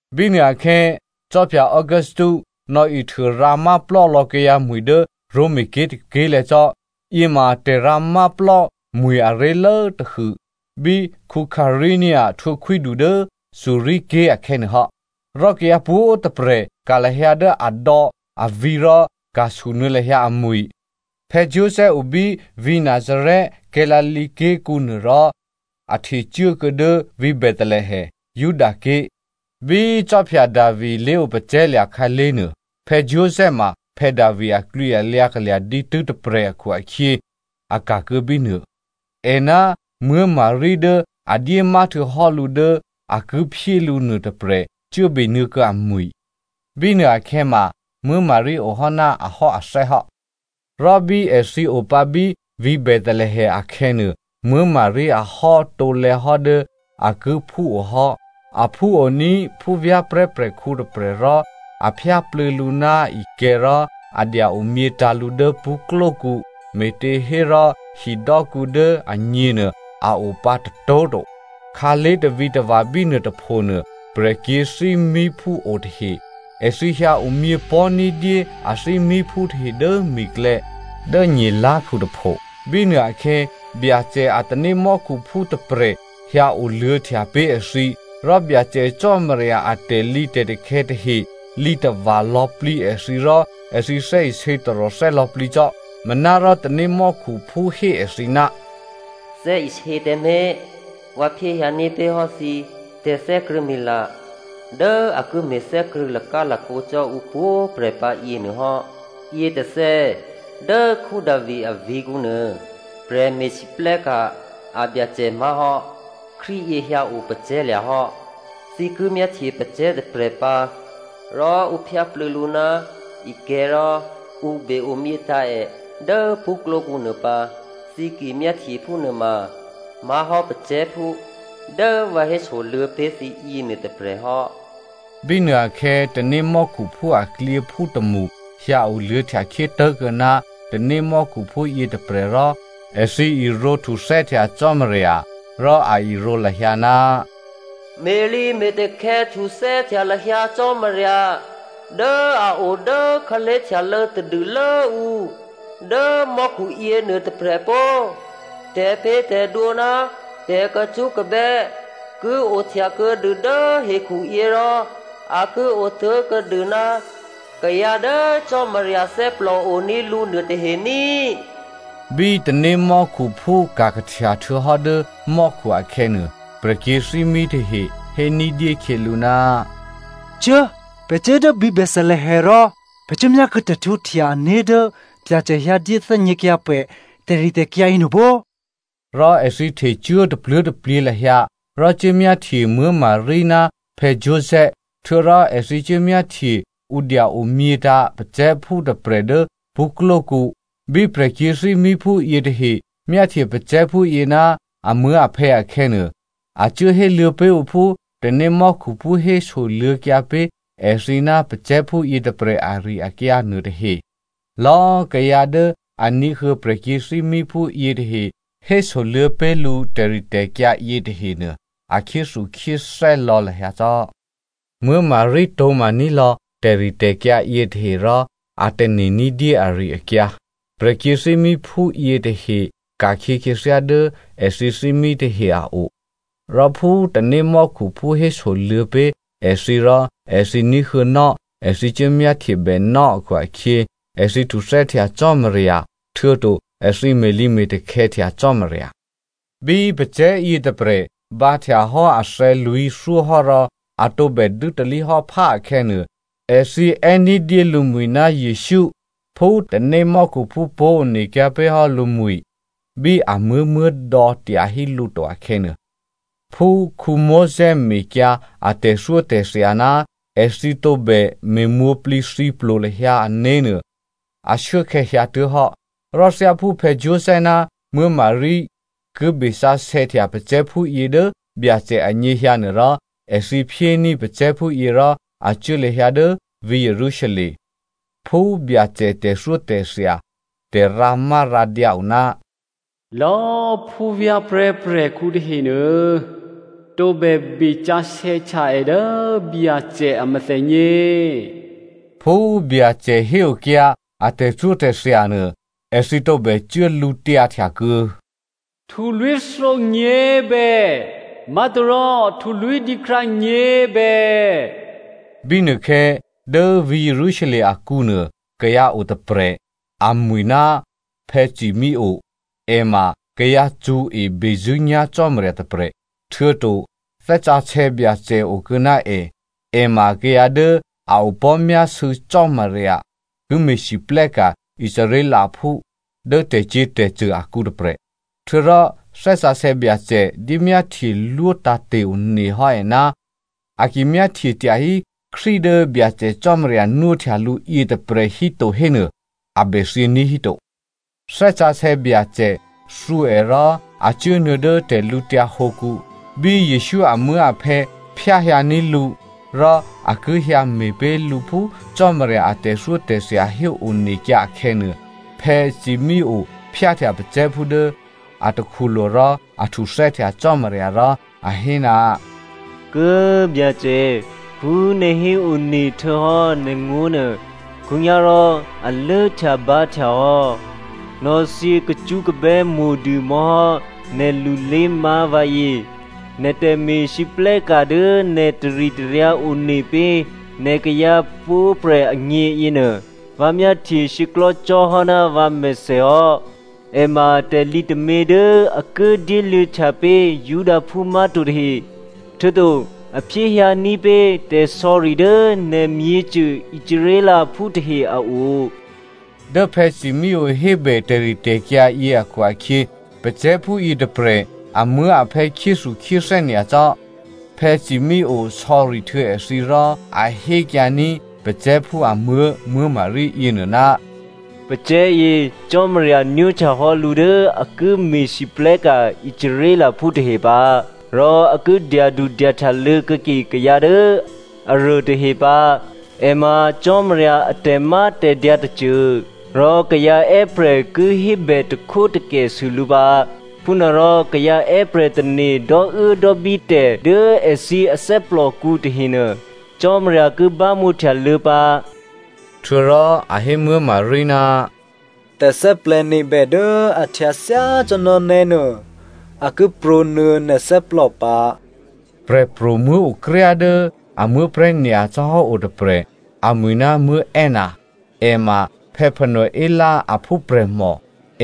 Bínuôakhè̌ khwí Augusto nò̌ihtuô rǎmá plò́lò̌ kayǎ mwi̤ dố Romaké̤ tôké̤lè̤̌ cò́. Yěma tè̤rǎmá plò́mwi̤ aré̤lố tôhû bí Quirino htwǒ khwídu dố Syria ké̤ akhè̌nuô hò́. Rò kayǎ pwǒ̤꤮ tôprè̤ ka̤ lahyǎ dố adò̌, avǐ̤ rò ka̤sunuô̌ lahyǎ amwi̤. Joseph o bí vǐ̤ Nazarè, Galilea ké̤kǔ nuô rò a htecuốkuô̌ dố vǐ̤ Bethelehem, Judaké̤, bí khwí Davi lé̤opacè̤̌lya̤ khǎlé̤nuô. Joseph ma Davi aklwǐalyǎ kalya̤ dǐtû́ tôprè̤ akhu-akhyě a ka̤kuô̌ bínuô. È ná Maria dố a dyémá htuô̌hò́ lǔ dố a ki phyé lǔ nuôtôprè̤ cuố benuô̌kuô̌ amwi̤. Bínuôakhè̌ ma Maria ohò́ ná ahò́athè́ hò́. Rò bí èthǐ o pǎ bí vǐ̤ Bethelehem akhè̌nuô, Maria ahò́ tǒlè̌ hò́ dố a ki phúo hò́. A phúoní̤ phúvyá̤prè̤́ prè̤khǔ tôprè̤ rò a phyáplû̌ lǔ ná ikè̤̌ rò a dya omyětǎ̤ lǔ dố pṳ́klókǔ, me̤těhérò hidò́kǔ dố agněnuô a o pǎ tôtó̤ to. Khǎlé̤ tavǐtava̤ bínuô tôphonuô, prè̤kyě̤thímíphú o tahe. Èthǐ hyǎ omyěpò̤́ ní̤dyé athímíphú tahe dố mi̤klè̌, dố nyelá̤khu tôpho. Bínuôakhè̌ Byacè a tanémò́khuphú tôprè̤ hyǎ oluô̌htya pé̤ èthǐ, rò Byacè Cò́marya a tè̤lǐtè̤takhè̌ tahe lǐ tava̤ lò̌plǐ èthǐ rò èthǐ thè́isě taròthè́ lò̌plǐ cò́. Manárò tanémò́khuphú hé èthǐ, “Thè́isě tǎmé̤! Vǎ phyéhyǎní̤ pé̤hò́ thǐ tè̤thè́krṳ̂̌mila dố a ki me̤ thè́krṳ̂̌ lakálakǒ cò́ ǔpwǒ̤꤮ prè̤ pǎ yěnuôhò́. Yětôthè̌ dố Davi avǐ̤kǔ nuô, prè̤me̤lwóhteka̤ a Byacè má̤hò́ Krístu yě hyǎ o pacè̤̌lya̤ hò́. Thǐ ki myáhtye pacè̤̌ tôprè̤ pǎ, rò ǔ phyáplû̌ lǔ ná ikè̤̌ rò ǔ be-omyětǎ̤ è dố pṳ́klókǔ nuô pǎ. Thǐ ki myáhtye phúnuôma má̤hò́ pacè̤̌phú dố vǎ hésoluô̌ pé̤ thǐ yěnuô tôprè̤ hò́.” Bínuôakhè̌ tanémò́khuphú aklyěphú tômṳ hyǎoluô̌htya khyé tố̤kuô̌ ná tanémò́khuphú yětôprè̤ rò èthǐ irǒ htuthè́htya Cò́marya rò a irǒ lahyǎ, “Me̤lǐme̤takhè̌ htuthè́htya lahyǎ Cò́marya dố a o dố khǎlé̤htyalô̌ tadûlố ǔ dố mò́khu yěnuô tôprè̤ pó꤮. Tè̤pě̤tè̤dwǒ ná tè̤kacṳ́kabè́ ki ohtya kuô̌dû dố hekhuyě rò a ki otố̤kuô̌dû ná kayǎ dố Cò́marya thè́plò oní̤ lǔ nuôtahe ní꤮.” Bí tanémò́khuphú ka̤ kahtya htuô̌hò́ dố mò́khu akhè̌nuô, prè̤kyě̤thímí tahe hé ní̤dyé khyělǔ, “Cuố꤮, pè̤ cuố dố vǐ̤ Bethelehem rò pè̤ cuốmyákuô̌ tè̤htwǒhtya-ané̤ dố Byacè hyǎ dyéthè́gněkyǎ pè̤ tè̤ritè̤kyǎ yěnuô pó꤮.” Rò èthǐ htecuố tapluố̤taplyě lahyǎ rò cuốmyáhtye Maria ná Joseph, htuô̌rò èthǐ cuốmyáhtye ǔ dya omyětǎ̤ pacè̤̌phú tôprè̤ dố pṳ́klókǔ. Bí prè̤kyě̤thímíphú yětahe myáhtye pacè̤̌phú yě ná amuố̤aphè̌ akhè̌nuô, a cuố héluô̌ pé̤ ǔ phú tanémò́khuphú hésoluô̌kyǎ pé̤ èthǐ ná pacè̤̌phú yětôprè̤ ari-akyǎ nuôtahe. Lò̌꤮ kayǎ dố a ní̤huô̌ prè̤kyě̤thímíphú yětahe hésoluô̌ pé̤ lǔ tè̤ritè̤kyǎ yětahenuô a khyéthukhyéthè́ lò̌ lahyǎ cò́. Maria tǒ̤maní̤ lò̌ tè̤ritè̤kyǎ yětahe rò a tane̤ ní̤dyé ari-akyǎ. Prè̤kyě̤thímíphú yětahe ka̤khyě khyěthyá dố èthǐ thímí tahe a o. Rò phú tanémò́khuphú hésoluô̌ pé̤ èthǐ rò èthǐ ní̤huô̌nò́, èthǐ cuố myáhtyebènò́ akhu-akhyě, èthǐ htuthè́htya Cò́marya, htuô̌to èthǐ me̤lǐme̤takhè̌htya Cò́marya. Bí pacè̤̌ yětôprè̤ bǎhtya hò́ athè̌ lwǐ̤thyó hò́rò a tǒbè dû́talí hò́ phá akhè̌nuô, èthǐ è́ ní̤dyé lǔmwi̤ ná Jesǔ phú tanémò́khuphú pó̤onekyǎ pé̤hò́ lǔmwǐ̤ bí amuố̤ muố̤dò̌ tyahí lǔ to akhè̌nuô. Phú Mosè mekyǎ a tè̤thyótè̤thya ná èthǐ tǒbè me̤mwǒ̤plǐthǐplo lahyǎ ané̤nuô, ashuốkhè̌ hyǎtuố̤hò́. Rò thyáphú Joseph ná Maria ki besǎsè̌htya pacè̤̌phúyě dố Byacè anyěhyǎ nuôrò, èthǐ phyéní̤ pacè̤̌phúyě rò a cuố lahyǎ dố vǐ̤ Jerusalem. (Phú Byacè tè̤thyótè̤thya tè̤rǎmárǎdyǎ o, “Lò̌꤮ phúvyá̤prè̤́ prè̤khǔ tahenuô tǒbè besǎsè̌htya è dố Byacè a mèthènyě.”) Phú Byacè héokyǎ a tè̤thyótè̤thya nuô, èthǐ tǒbè cuố lǔtyǎhtya kuô̌ “Htulwí̤thǒ nyě̤bè má̤torò htulwí̤ dǐkrǎ nyě̤bè.” Bínuôkhè̌, dố vǐ̤ Jerusalem akǔnuô kayǎ otôprè̤, amwi̤ ná Simeonè. È ma kayǎ cṳ̌e bezṳ̂́nyá̤ Cò́marya tôprè̤, htuô̌to Thè́ Sǎsè̌ Byacè okuô̌ ná è. È ma kayǎ dố a opò̤́myásû̌ Cò́marya ki me̤lwóhteka̤ Israelphú dố tè̤cyě̤tè̤cṳ̂ akǔ tôprè̤. Htuô̌rò Thè́ Sǎsè̌ Byacè dyémyáhtyelwó tǎ̤te̤ one hò́ è, a ki myáhtye tyahí Krístu dố Byacè Cò́marya nwóhtya lǔ yětôprè̤ híto hénuô, a bèthyění̤ híto. Thè́ Sǎsè̌ Byacè thǔ è rò a cuốnuô̌ dố tè̤lǔtyǎ hǒkǔ. Bí Jesǔ amuố̤aphè̌ phyáhyǎní̤ lǔ, rò a ki hyǎme̤ pé̤ lǔ phú Cò́marya a tè̤thyótè̤thya héonekyǎ akhè̌nuô, Simeonè phyáhtya pacè̤̌phú dố a takhulo̤ rò a htuthè́htya Cò́marya rò a hé, “Kố꤮ Byacè, phú nè̤ héone htuô̌hò́ nè̤ngó̤ nuô khǒnyá̤rò a lốhtyabǎhtya hò́, nò̌thyě kacṳ́kabè́ mo̤dû mò̌hò́ nè̤lulé má̤ vǎyě. Nè̤ tè̤me̤lwóhteka̤ dố nè̤ taritaryǎ one pé̤ nè̤ kayǎ pwǒ̤prè̤ agně yěnuô, vǎ myáhtye shyěklò̤́ cò́hò́ ná vǎmèthè hò́. È ma tè̤lǐ tômě dố a ki dyéluô̌htya pé̤ Judaphú má̤to tahe, htuô̌to a phyéhyǎní̤ pé̤ tè̤sò̌ri dố nè̤ myěcô Israelphú tahe a o.” Dố Simeonè hébè tè̤ritè̤kyǎ yě akhu-akhyě, pacè̤̌phú yětôprè̤ amuố̤aphè̌ khyéthukhyéthè́ nyacò́. Simeonè sò̌ri htuô̌ èthǐ rò a hékyǎní̤ pacè̤̌phú amuố̤ Maria yěnuô, “Pacè̤̌yě Cò́marya nwóhtyahò́ lǔ dố a ki me̤lwóhteka̤ Israelphú tahe pǎ, rò a ki dyadudyahtyalô̌ kuô̌ke kayǎ dố aruô tahe pǎ. È ma Cò́marya a tè̤mátè̤dyǎ tôcô, rò kayǎ è́prè̤ ki hébè takhwótakèsû lǔ pǎ. Phúnuôrò kayǎ è́prè̤ tane̤ dò́uốdò́bí tè̤ dố èthǐ athè́plòkǔ tahenuô, Cò́marya ki bámǒhtyaluô̌ pǎ” htuô̌rò a hé Maria, “Tè̤thè́plè̤̌nebè dố a htyǎ thyácò́ná nè́ nuô a ki prǒnuô̌ nè̤ thè́plò pǎ.” Prè̤pro̤muố̤ okryá dố a muố̤prè̤́ nyacò́ hò́ o tôprè̤, amwi̤ ná Anna. È ma Phanuel aphúprè̤mò,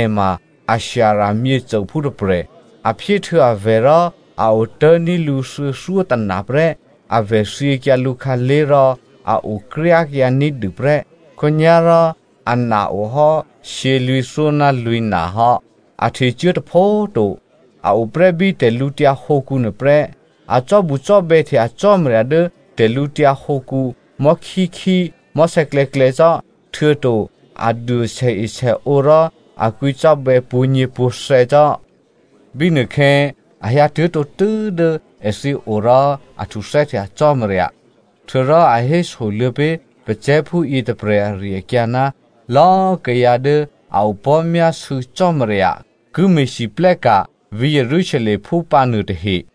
è ma Asher myěcôphú tôprè̤. A phyéhtuô̌ avè̤ rò a otố̤ní̤ lǔ thuô̌thyótôna prè́. Avè̤ thyěkyǎ lǔkhǎlé̤ rò a okryákyǎ ní̤dû prè́. Khǒnyá̤rò ana o hò́ shyělwǐ̤thyó ná lwǐ̤na hò́. A htecuố tôpho꤮ to, a oprè́ bí tè̤lǔtyǎ hǒkǔnuô prè́. A cò́bucò́bè̌htya Cò́marya dố tè̤lǔtyǎ hǒkǔ mò̤́khíkhí mò̤́sè̌klè̌klè̌ cò́, htuô̌to a duôe sèesèǒ rò a kwǐcò́bè̌ pwǒ̤nyěpwǒ̤thè̌ cò́. Bínuôkhè̌, a hyǎtuố̤ tǒtû́ dố èthǐ o rò a htuthè́htya Cò́marya. Htuô̌rò a hésoluô̌ pé̤ pacè̤̌phú yětôprè̤ ari-akyǎ ná lò̌꤮ kayǎ dố a opò̤́myásû̌ Cò́marya ki me̤lwóhteka̤ vǐ̤ Jerusalemphú pǎ nuôtahe.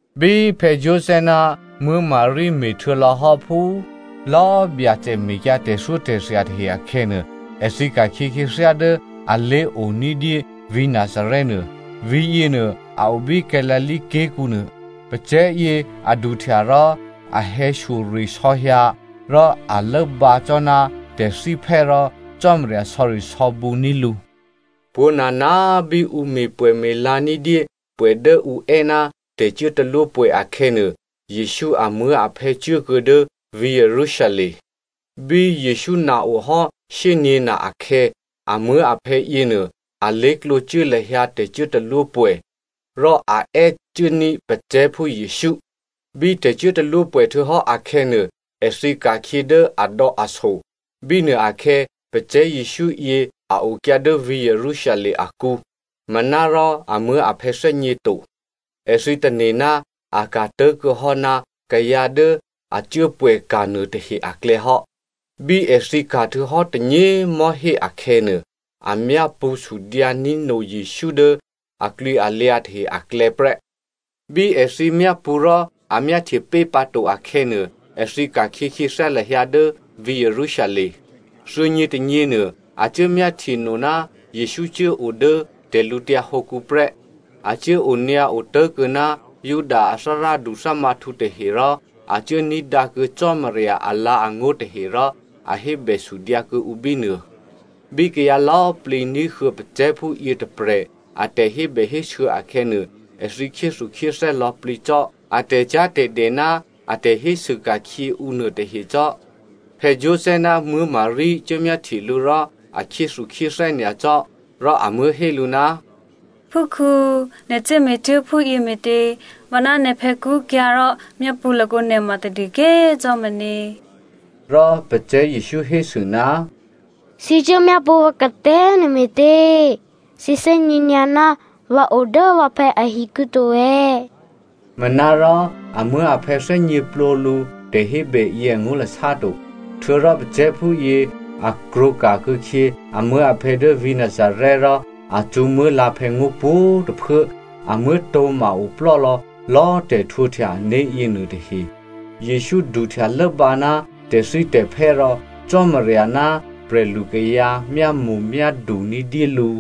Bí Joseph ná Maria me̤htuô̌lò̌hò́ phú lò̌꤮ Byacè mekyǎ tè̤thyótè̤thya tahe akhè̌nuô, èthǐ ka̤khyě khyěthyá dố alé̤o ní̤dyé vǐ̤ Nazarè nuô. Vǐ̤yěnuô a o bí Galilea ké̤kǔ nuô. Pacè̤̌yě a duhtya rò a hè̌shyoresò̌ hyǎ, rò a lốbǎ cò́ ná tè̤thíphè́ rò Cò́marya sò̌risò̌bǔní̤ lǔ. Pwǒ̤nana꤮ bí ǔ me̤pwè̌me̤la ní̤dyé pwè̌ dố ǔ è́ ná tè̤cuốtalwópwè̌ akhè̌nuô, Jesǔ amuố̤aphè̌ cuốkuô̌ dố vǐ̤ Jerusalem. Bí Jesǔ na ohò́ shyényě̤na akhè̌, amuố̤aphè̌ yěnuô, alé̤klǒ cuố lahyǎ tè̤cuốtalwópwè̌, rò a è́ cuốní̤ pacè̤̌phú Jesǔ. Bí tè̤cuốtalwópwè̌ htuô̌hò́ akhè̌nuô, èthǐ ka̤khyě dố adò̌aso. Bínuôakhè̌, pacè̤̌ Jesǔ yě a okyǎ dố vǐ̤ Jerusalem akǔ, manárò amuố̤aphè̌ thè́gně to. Èthǐ tane̤ ná a ka̤ tố̤kuô̌ hò́ ná kayǎ dố a cuốpwè̌ka̤ nuôtahe aklè̌ hò́. Bí èthǐ ka̤ htuô̌hò́ tônyě꤮ mò̤́hé akhè̌nuô, a myápṳ̌ sudyǎní̤ no Jesǔ dố aklwǐalyǎ tahe aklè̌ prè́. Bí èthǐ myápṳ̌ rò a myáhtye pé̤ pǎ to akhè̌nuô, èthǐ ka̤khyě khyěthyá lahyǎ dố vǐ̤ Jerusalem. Thuô̌nyětônyěnuô, a cuố myáhtyeno ná Jesǔ cuố o dố tè̤lǔtyǎ hǒkǔ prè́. A cuố onyǎo tố̤kuô̌ ná Juda a thárádu thǎmǎhtǔ tahe rò a cuốní̤dǎkuô̌ Cò́marya alǎ̤angó̤ tahe rò a hébèsudyǎ kuô̌ǔ bínuô. Bí kayǎ lò̌꤮ plǐ ní̤huô̌ pacè̤̌phú yětôprè̤ a tè̤hébèhésû̌ akhè̌nuô, èthǐ khyéthukhyéthè́ lò̌plǐ cò́ a tè̤cyá̤tè̤dè ná a tè̤hésû ka̤khyě ǔ nuôtahe cò́. Joseph ná Maria cuốmyáhtye lǔ rò a khyéthukhyéthè́ nyacò́, rò amuố̤ hé lǔ, “Phúkhǔ, nè̤ cuố me̤tuố̤ phúyě me̤tě? Vǎ ná nè̤phè̌ kṳ́kyǎ̤ rò myápṳ̌ lakǒ nè̤ ma tadû꤮ ké̤ cò́ meně.” Rò pacè̤̌ Jesǔ hésû, “Thǐ cuố myápṳ̌ vǎ katè̤́ nuô me̤tě? Thǐ thè́gně nyǎ ná vǎ o dố vǎphè̌ ahikǔ to è̌.” Manárò amuố̤aphè̌ thè́gněplǒ lǔ tè̤hébè yě angó̤lasá to. Htuô̌rò pacè̤̌phúyě a krwǒ ka̤kuô̌khyě amuố̤aphè̌ dố vǐ̤ Nazarè rò a cṳ̌ muố̤lǎ̤phè̌ngó̤ pwǒ̤꤮ tôphuố. Amuố̤ tǒ̤ma oplò́lò̌ lò̌꤮ tè̤htwǒhtya ané̤ yěnuôtahe. Jesǔ duhtya lốbǎ ná tè̤thítè̤phè́ rò Cò́marya ná prè̤lukayǎ myámo̤myádu ní̤dyé lǔ.